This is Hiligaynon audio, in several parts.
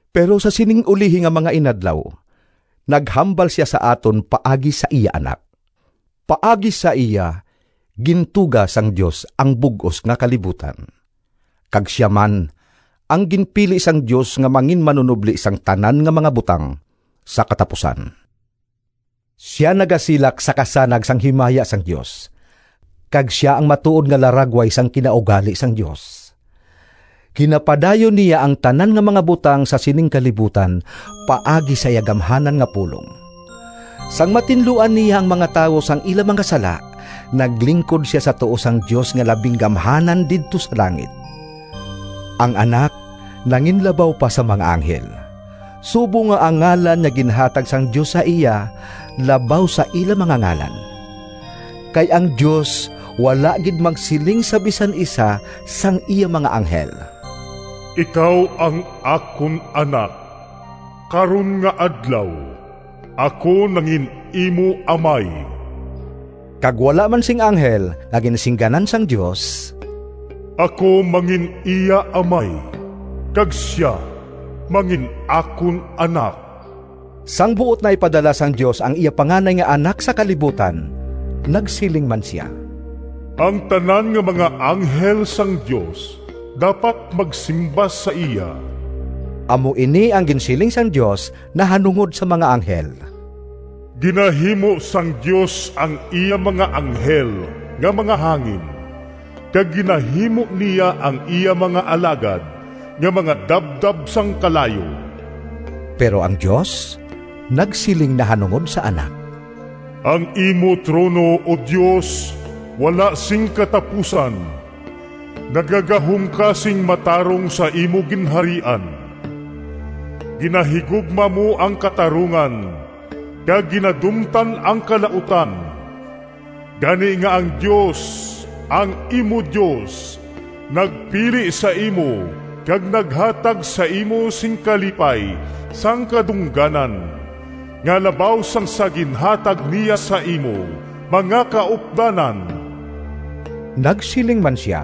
Pero sa sining ulihi nga mga inadlaw naghambal sia sa aton paagi sa iya Anak. Paagi sa iya gintuga sang Dios ang bug-os nga kalibutan, kag sia man ang ginpili sang Dios nga manginmanunobli sang tanan nga mga butang sa katapusan. Sia nagasilak sa kasanag sang himaya sang Dios, kag sia ang matuod nga laragway sang kinaugali sang Dios. Ginapadayon niya ang tanan nga mga butang sa sining kalibutan paagi sa iya gamhanan nga pulong. Sang matinluan niya ang mga tawo sang ila mga sala, naglingkod sia sa tuo sang Dios nga Labing Gamhanan didto sa langit. Ang Anak nanginlabaw pa sa mga anghel, subong nga ang ngalan nga ginhatag sang Dios sa iya labaw sa ila mga ngalan. Kay ang Dios wala gid magsiling sa bisan isa sang iya mga anghel: “Ikaw ang akon anak Karon nga adlaw Ako nangin-imo Amay.” Kag wala man sing anghel nga ginsingganan sang Dios: “Ako mangin-iya Amay, Kag sia mangin-akon Anak.” Sang buot na ipadala sang Dios ang iya panganay nga Anak sa kalibutan, nagsiling man sia: “Ang tanan nga mga anghel sang Dios Dapat magsimba sa iya.” Amo ini ang ginsiling sang Dios nahanungod sa mga anghel: “Ginahimo sang Dios Ang iya mga anghel nga mga hangin, Kag ginahimo niya Ang iya mga alagad Nga mga dabdab sang kalayo.” Pero ang Dios nagsiling nahanungod sa Anak: “Ang imo trono, O Dios, Wala sing katapusan! Nagagahom ka sing matarong Sa imo ginharian. Ginahigugma mo ang katarungan Kag ginadumtan ang kalautan, Gani nga ang Dios, ang imo Dios, Nagpili sa imo kag naghatag sa imo Sing kalipay sang kadungganan Nga labaw sang sa ginhatag niya Sa imo mga kaupdanan.” Nagsiling man sia: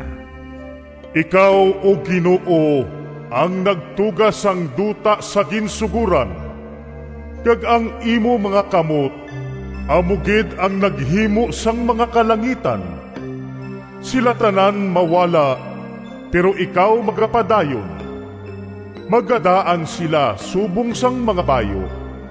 “Ikaw, O Ginoo, Ang nagtuga sang duta sa ginsugoran, Kag ang imo mga kamot Amo gid ang naghimo Sang mga kalangitan. Sila tanan mawala, Pero ikaw magapadayon. Magadaan sila subong sang mga bayu.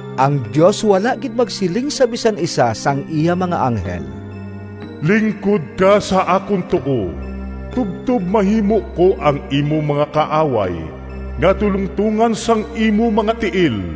Ang Dios wala gid magsiling sa bisan isa sang iya mga anghel: “Lingkod ka sa akon tuo, Tubtob mahimo ko Ang imo mga kaaway Nga tulongtongan sang imo mga tiil.”